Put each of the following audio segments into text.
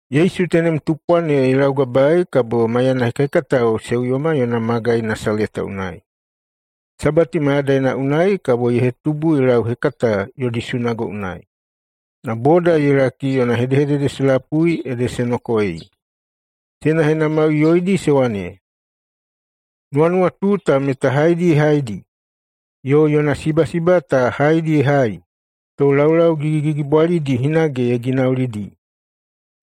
Yesu tenem tupwa ne ye laugabaei kabo maiyana hekahekatao se uyoma yona magai Nasaleta unai. Sabati mayadaina unai kabo ye hetubu ye lauhekata yodi sunago unai. Na boda ye laki yona hedehedede se lapui ede se nokoei. Se henahenamaiꞌuyoidi se wane, “Nuwanuwatu ta meta haedi ye haidi? Yo yona sibasiba ta haedi ye hai, to laulau gigigigibwalidi hinage ye ginaulidi?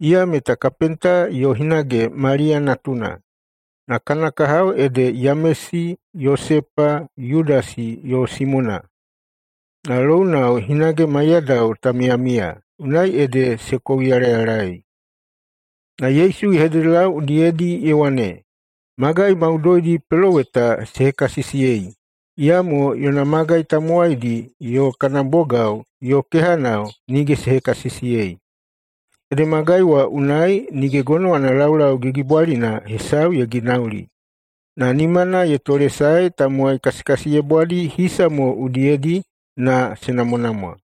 Iya meta kapenta yo hinage Maliya natuna, na kana kahao ede Yamesi, Yosepa, Yudasi yo Simona. Na lounao hinage maiyadao ta miyamiya.” Unai ede se kouyalayalaei. Na Yesu ye hededelau udiyedi ye wane, “Magai maudoidi peloweta se hekasisiyei, iyamo yona magai tamowaidi yo kana bogao yo kehanao nige se hekasisiyei.” Ede magai wa unai nige gonowana laulau gigigigibwalina hesau ye ginauli, na nimana ye tolesae tamowai kasikasiyebwadi hisa mo udiyedi na se namwanamwa.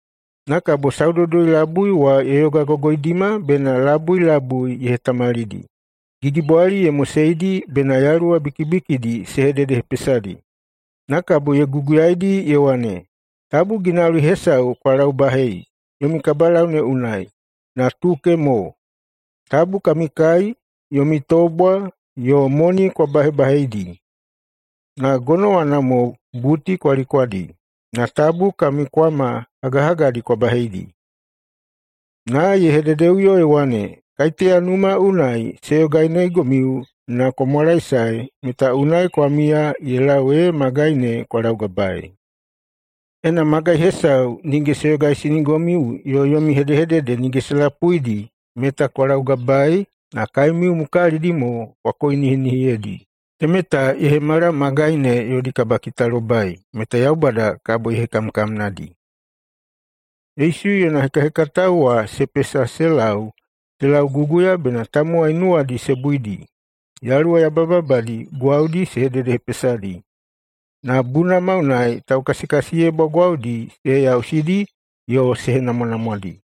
Na kabo Saudoudoi-labui wa ye yogagogoidima bena labui labui ye hetamalidi. Gigibwali ye moseidi bena yaluwa bikibikidi se hededehepesadi. Na kabo ye guguyaidi ye wane, “Tabu ginauli hesau kwa laubahei yomi kabalau ne unai, na tuke mo. Tabu kami kai, yomi tobwa, yo moni kwa bahebaheidi. Na gonowana mo buti kwa likwadi, na tabu kami kwama hagahagadi kwa baheidi.” Na ye hededeꞌuyo ye wane, “Kaiteya numa unai [se yoganeigomiu na] kwa mwalaesae, meta unai kwa miya ye lau ee magai me kwa laugabaei. Ena magai hesau nige se yogaisinigomiu yo yomi hedehedede nige se lapuidi, meta kwa laugabaei na kaemiu mukalidi mo kwa koinihinihiyedi. Temeta ye hemala magai ne yodi kabakitalobai meta Yaubada kabo ye hekamkamnadi.” Yesu yona hekahekatao wa se pesa se lau se lauguguya bena tamowai nuwadi se buidi. Yaluwa yabayababadi gwaudi se hededehepesadi, na bunama unai taukasikasiyebwa gwaudi se heyausidi yo se henamwanamwadi.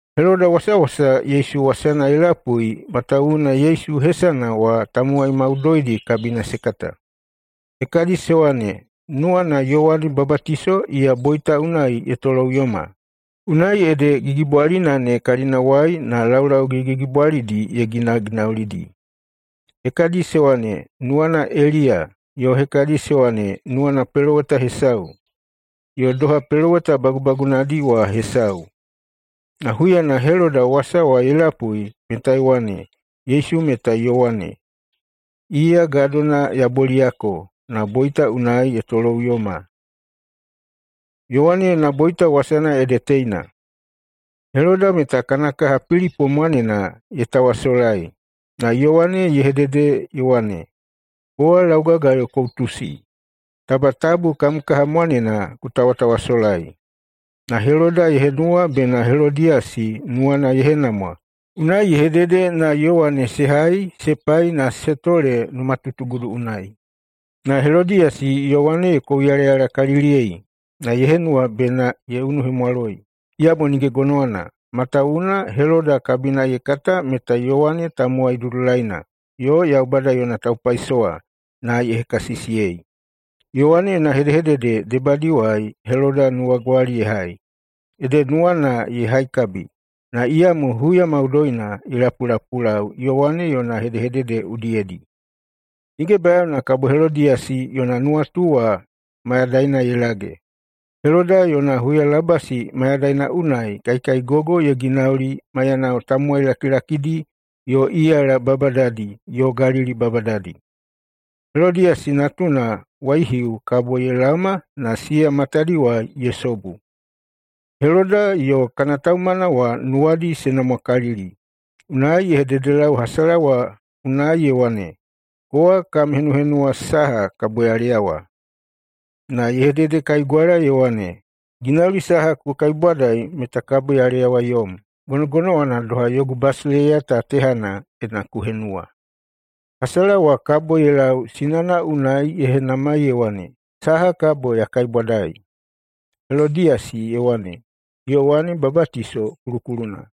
Heloda wasawasa Yesu wasana ye lapui, matawuwuna Yesu hesana wa tamowai maudoidi kabina se kata. Hekadi se wane, “Nuwana Yowane Babatiso iya boita unai ye toloꞌuyoma, unai ede gigibwalina ne kalinawai na laulau gigigigibwalidi ye ginaginaulidi.” Hekadi se wane, “Nuwana Eliya”, yo hekadi se wane, “Nuwana peloweta hesau, yo doha peloweta bagubagunadi wa hesau.” Na huyana Heloda wasa wa ye lapui meta ye wane, “Yesu meta Yowane. Iya gadona ya boliyako, na boita unai ye toloꞌuyoma.” [Yowane yona boita wasana ede teina:] Heloda meta kana kaha Pilipo mwanena ye tawasolai, na Yowane ye hedehedede ye wane, “Kowa laugagayo ku utusi, taba tabu kam kaha mwanena ku tawatawasolai!” Na Heloda ye henuwa bena Helodiyasi nuwana ye henamwa, unai ye hedede na Yowane se hai se pai na se tole numatutugudu unai. Na Helodiyasi Yowane ye kouyalayalakaliliyei, na ye henuwa bena ye unuhemwaloi. Iyamo nige gonowana, matawuwuna Heloda kabina ye kata meta Yowane tamowai dudulaina yo Yaubada yona taupaisowa, na ye hekasisiyei. Yowane yona hedehedede debadiwai Heloda nuwagwali ye hai, ede nuwana ye haikabi, na iyamo huya maudoina ye lapulapulau Yowane yona hedehedede udiyedi. Nige bayaona kabo Helodiyasi yona nuwatu wa mayadaina ye lage. Heloda yona huyalabasi mayadaina unai kaikaigogo ye ginauli maiyanao tamowai lakilakidi yo iyala babadadi yo Galili babadadi. Helodiyasi natuna waihiu kabo ye laoma na siya matadiwai ye sobu. Heloda yo kana taumana wa nuwadi se namwakalili, unai ye hededelau hasala wa unai, ye wane, “Kowa kam henuhenuwa saha kabo ya leyawa.” Na ye hededekaigwala ye wane, “Ginauli saha ku kaibwadai meta kabo ya leyawa yom. Gonogonowana doha yogu basileiya ta tehana, ena ku henuwa.” Hasala wa kabo ye lau sinana unai ye henamai ye wane, “Saha kabo ya kaibwadai?” Helodiyasi ye wane, “Yowane Babatiso kulukuluna.”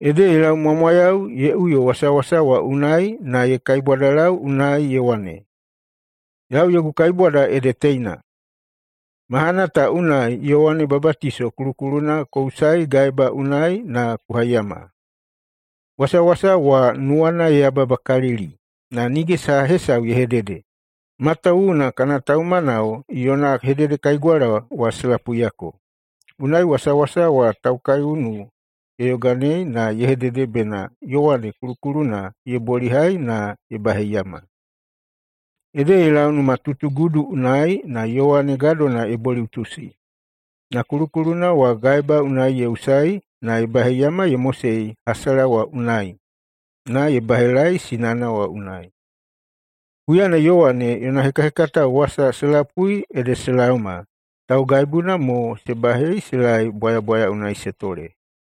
Ede ye laumwamwayau ye uyo wasawasa wa unai na ye kaibwadalau unai ye wane, “Yau yogu kaibwada ede teina: Mahana ta unai Yowane Babatiso kulukuluna ku usai gaeba unai na ku haiyama.” Wasawasa wa nuwana ye yababakalili, na nige saha hesau ye hedede, matawuwuna kana taumanao yona hededekaigwala wa se lapuiyako. Unai wasawasa wa taukaiunu ye yoganei na ye hedede bena Yowane kulukuluna ye bolihai na ye baheiyama. Ede ye lau numatutugudu unai na Yowane gadona ye boliꞌutusi na kulukuluna wa gaeba unai ye usaei na ye baheiyama ye mosei hasala wa unai, na ye bahelaei sinana wa unai. Huyana Yowane yona hekahekatao wasa se lapui ede se laoma, taugaibuna mo se bahei se laei bwayabwaya unai se tole.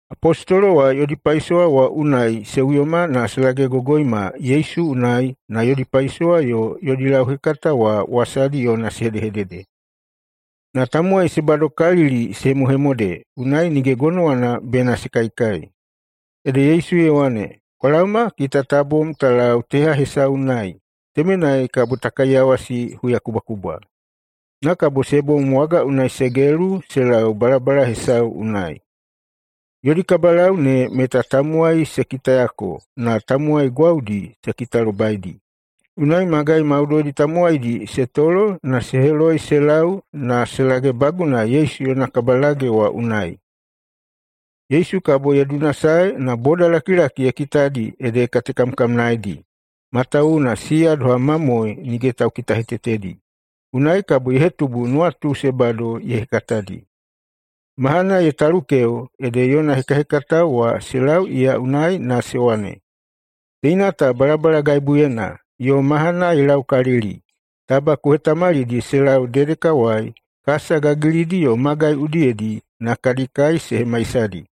Apostolo wa yodi paisowa wa unai se uyoma na se lagegogoima Yesu unai na yodi paisowa yo yodi lauhekata wa wasadi yona se hedehedede. Na tamowai se badokalili se hemohemode, unai nige gonowana bena se kaikai. Ede Yesu ye wane, “Kwa laoma, kita ta bom ta lau teha hesau unai. Temenai kabo ta kaiyawasi huyakubwakubwa.” Na kabo se bom waga unai se gelu se lau balabala hesau unai. Yodi kabalau ne meta tamowai se kitayako na tamowai gwaudi se kitalobaidi. Unai magai maudoidi tamowaidi se tolo na se heloi se lau na se lagebaguna Yesu yona kabalage wa unai. Yesu kabo ye dunasae na bodalakilaki ye kitadi ede ye katekamkamnaedi, matawuwuna siya doha mamoe nige taukitahetetedi. Unai kabo ye hetubu nuwatu se bado ye hekatadi. Mahana ye talukeo, ede yona hekahekatao wa se lau iya unai na se wane, “Teina ta balabalagaibuyena, yo mahana ye laukalili. Taba ku hetamalidi se lau dedekawai kasa gagilidi yo magai udiyedi na kadi kai se hemaisadi.”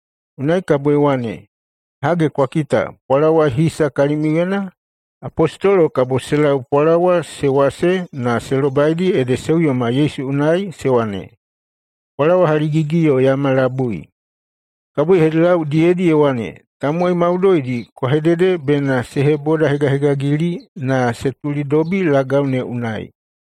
Unai kabo ye wane, “Hage, kwa kita, pwalawa hisa kalimiuyena?” Apostolo kabo se lau pwalawa [se wase na] se lobaidi ede se uyoma Yesu unai na se wane, “Pwalawa haligigi yo yama labui.” Kabo ye hededelau udiyedi ye wane, “Tamowai maudoidi kwa hedede bena se hebodahegahegagili na se tulidobi lagau ne unai.”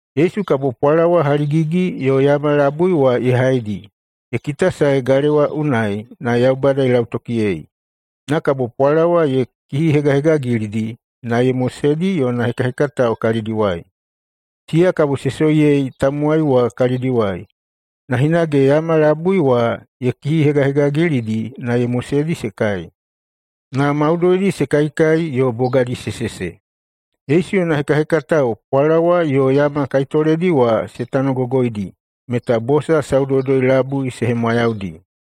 Yesu kabo pwalawa haligigi yo yama labui wa ye haidi, ye kitasae galewa unai, na Yaubada ye lautokiyei. Na kabo pwalawa ye kihihegahegagilidi na ye moseidi yona hekahekatao kalidiwai. Siya kabo se soiyei tamowai wa kalidiwai. Na hinage yama labui wa ye kihihegahegagilidi na ye moseidi se kai. Na maudoidi se kaikai yo bogadi se sese. Yesu yona hekahekatao pwalawa yo yama kaitoledi wa se tanogogoidi, meta bosa saudoudoi-labui se hemwayaudi.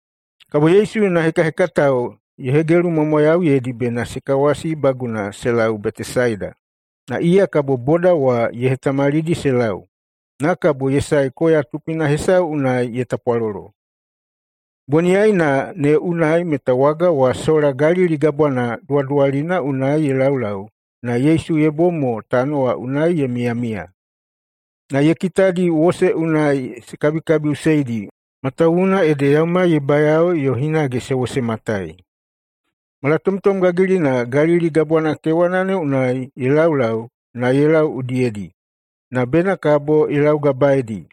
Kabo Yesu yona hekahekatao ye hegelumwamwayauyeidi bena se kawasibaguna se lau Betesaida, na iya kabo boda wa ye hetamalidi se lau. Na kabo ye sae koya tupina hesau unai ye tapwalolo. Boniyaina ne unai meta waga wa sola Galili Gabwana duwaduwalina unai ye laulau, na Yesu ye bom mo tano wa unai ye miyamiya. Na ye kitadi wose unai se kabikabiꞌuseidi, matawuwuna ede yaumai ye bayao yo hinage se wosematai. Malatomtom gagilina Galili Gabwana kewana ne unai ye laulau na ye lau udiyedi, na bena kabo ye laugabaeidi.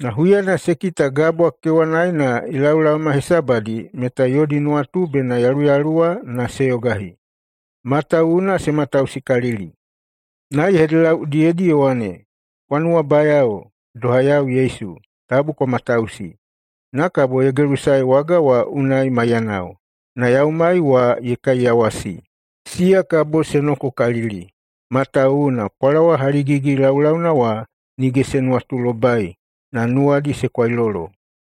Na huyana se kita gabwa kewanaena ye laolaoma hesabadi meta yodi nuwatu bena yaluyaluwa na se yogahi, matawuwuna se matausikalili. Na ye hededelau udiyedi ye wane, “Kwa nuwabayao! Doha yau Yesu! Tabu kwa matausi!” Na kabo ye gelusae waga wa unai maiyanao, na yaumai wa ye kaiyawasi. Siya kabo se nokokalili, matawuwuna pwalawa haligigi laulauna wa nige se nuwatulobai, na nuwadi se kwailolo.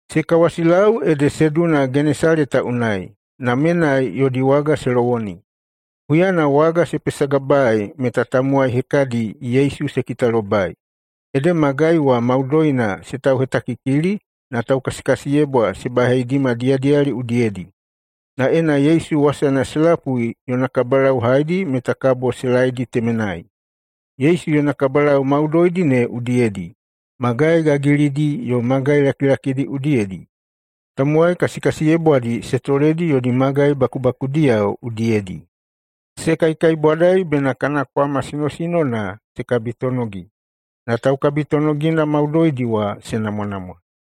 Se kawasilau ede se duna Genesaleta unai, na menai yodi waga se lowoni. Huyana waga se pesagabaei meta tamowai hekadi Yesu se kitalobai, ede magai wa maudoina se tauhetakikili na taukasikasiyebwa se baheidima diyadiyali udiyedi, na ena Yesu wasana se lapui yona kabalau haedi meta kabo se laedi temenai. Yesu yona kabalau maudoidi ne udiyedi, magai gagilidi yo magai lakilakidi udiyedi, tamowai kasikasiyebwadi se toledi yodi magai bakubakudiyao udiyedi. Se kaikaibwadai bena kana kwama sinosinona se kabitonogi, na taukabitonogina maudoidi wa se namwanamwa.